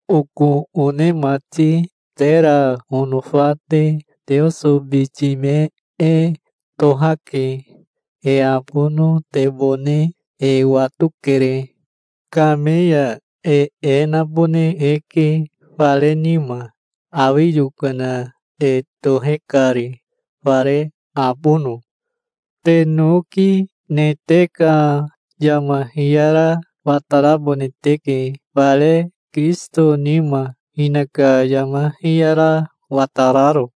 Oko one mati, tera onofa te, Teoso biti me e tohake. E abonotebone e watokere. Kame ya e e nabone eke fare nima, awi yokana e tohe kari, fare abono. Te noki ne te ka yama hiyara watarabone teke, fare Kirisito nima, hinaka yama hiyara watararo.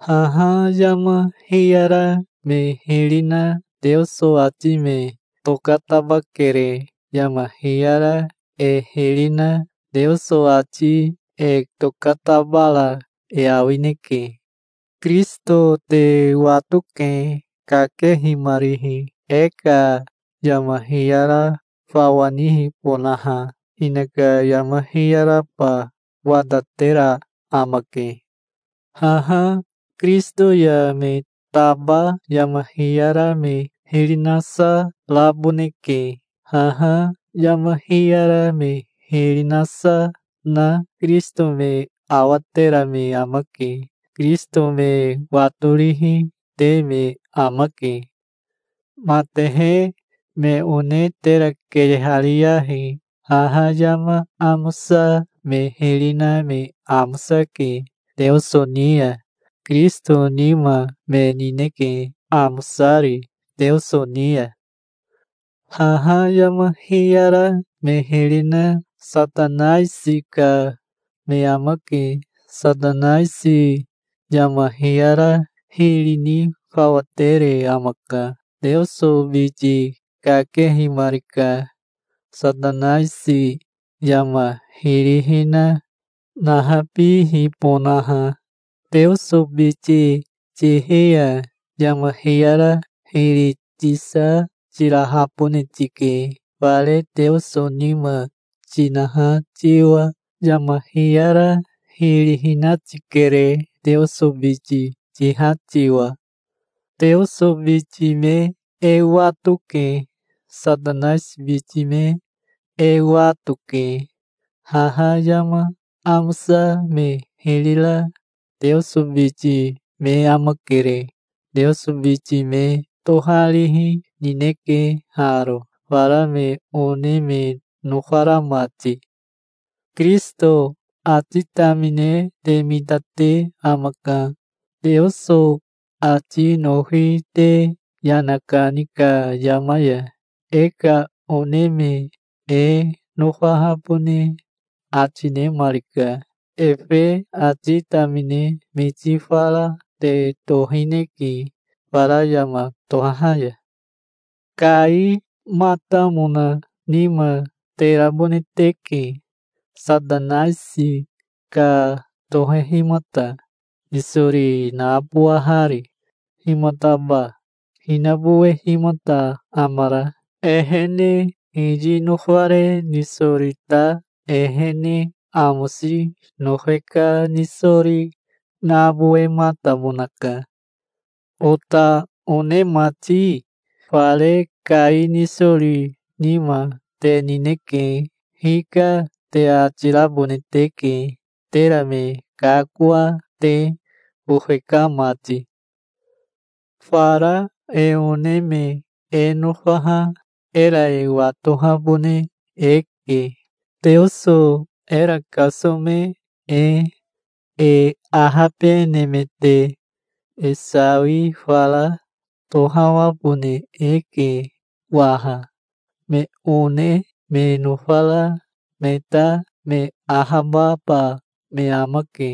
Haha yama hiyara me hiri na Teoso ati me tokatabakere. Yama hiyara e hiri na Teoso ati e tokatabara e awineke. Kirisito te watoke, kakehimarihi, e ka yama hiyara fawa nihibonaha. Hinaka yama hiyaraba watatera amake. Haha Kirisito ya me taba yama hiyara me hiri nasa raboneke. Haha yama hiyara me hiri nasa na Kirisito me awatera me amake. Kirisito me watorihi te me amake. Matehe me one tera keyehariyahi. Haha yama amosa me hiri na me amosake Teoso ni ya. Kirisito nima me nineke, amosari Teoso ni ya. Haha yama hiyara me hiri na Satanaisi ka me amake. Satanaisi yama hiyara hiri ni fawa tere amaka. Teoso biti kakehimarika, Satanaisi yama hiri hina nahabihibonaha. Teoso biti tihi ya yama hiyara hiri tisa tirahabone tike, fare Teoso nima tinaha tiwa. Yama hiyara hiri hina tikere, Teoso biti tiha tiwa. Teoso biti me e watoke. Satanaisi biti me e wato, ke. Haha yama amosa me hiri ra Teoso biti me amakere. Teoso biti me toharihi nineke haro, fara me one me nofara mati. Kirisito ati tamine te mitate amaka, Teoso ati nofi te yana kani ka yama ya. E ka one me e nofahabone ati nemarika. Efe ati tamine miti fara te tohineke fara yama tohaha ya. Kaimatamona nima te rabone teke, Satanaisi ka tohehimata, nisori nabowahari. Himataba hinabowehimata amara? Ehene hiyi nofare nisori ta ehene amosi nofe ka nisori nabowematamonaka. Ota one mati, fare Kai nisori nima te nineke. "Hika", te ati rabone teke, tera me kakoa te, bofe ka mati. Fara e one me e nofaha era e watohabone eke, Teoso era kasome e. E ahabenemete e sawi fara tohawabone eke waha. Me one me nofara me ta me ahababa me amake.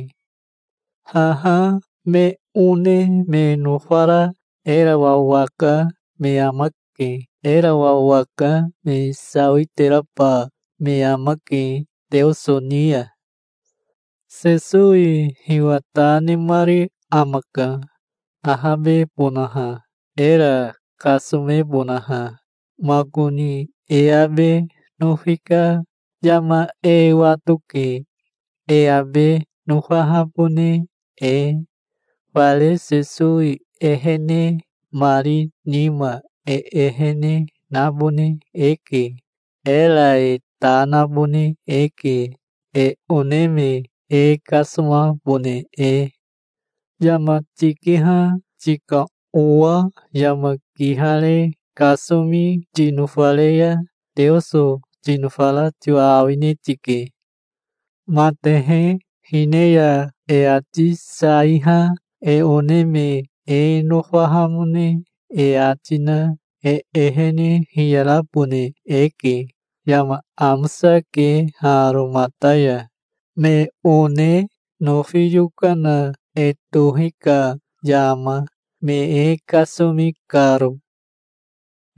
Haha me one me nofara era wawaka me amake. Era wawaka me sawiteraba me amake Teoso ni ya. Sesowi hiwa ta nemari amaka ahabebonaha, era kasomebonaha. Makoni e abe nofi ka yama e watoke, e abe nofahabone e. Fare Sesowi ehenemari nima e ehene nabone eke. Era e ta nabone eke, e one me e kasomabone e. Yama tikiha tika owa yama kihare kasomi tinofare ya Teoso tinofara tiwa awine tike. Matehe hine ya e ati saiha e one me e nofahamone e ati na e ehene hiyarabone eke. Yama amosake haro mata ya, me one nofi yokana e tohi ka yama, me e kasomi karo.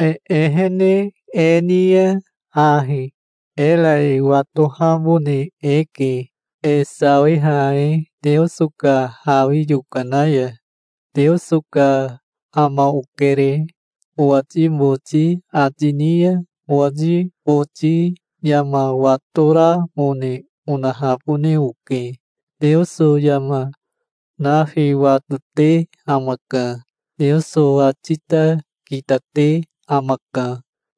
E ehene e ni ya ahi era e watohabone eke, e sawiha e Teoso ka hawi yokana ya. "Teoso ka ama okere", owati boti ati ni ya owati boti yama watoramone onahabone oke. Teoso yama nafi watote amaka. Teoso ati ta kitate amaka.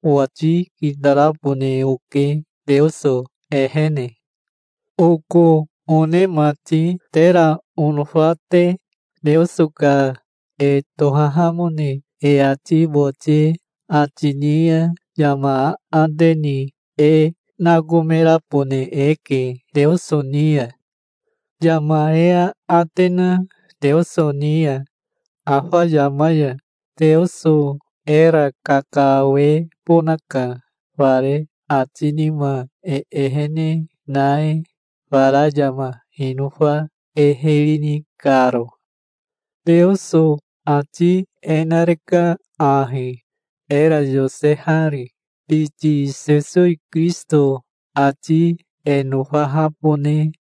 Owati kitarabone oke Teoso ehene. Oko one mati, tera onofa te, Teoso ka e tohahamone e ati boti ati ni ya yama aate ni e nakomerabone eke Teoso ni ya. Yama e aate na Teoso ni ya afa yama ya Teoso era kakawebonaka, fare ati nima e ehene na e, fara yama hinofa e hiri, ni karo. Teoso ati e nareka ahi, era yosehari: biti Sesowi Kirisito ati e nofahabone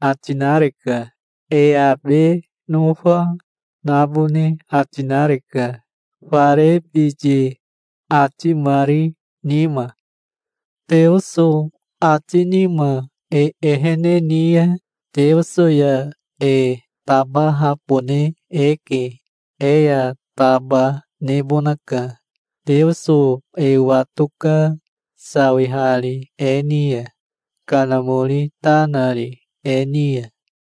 ati nareka. E abe nofa, nabone ati nareka, fare biti atimari nima. Teoso ati nima e ehene ni ya Teoso ya e tabahabone eke. E ya taba nebonaka. Teoso e watoka, sawihari e ni ya, Kanamori ta nari e ni ya.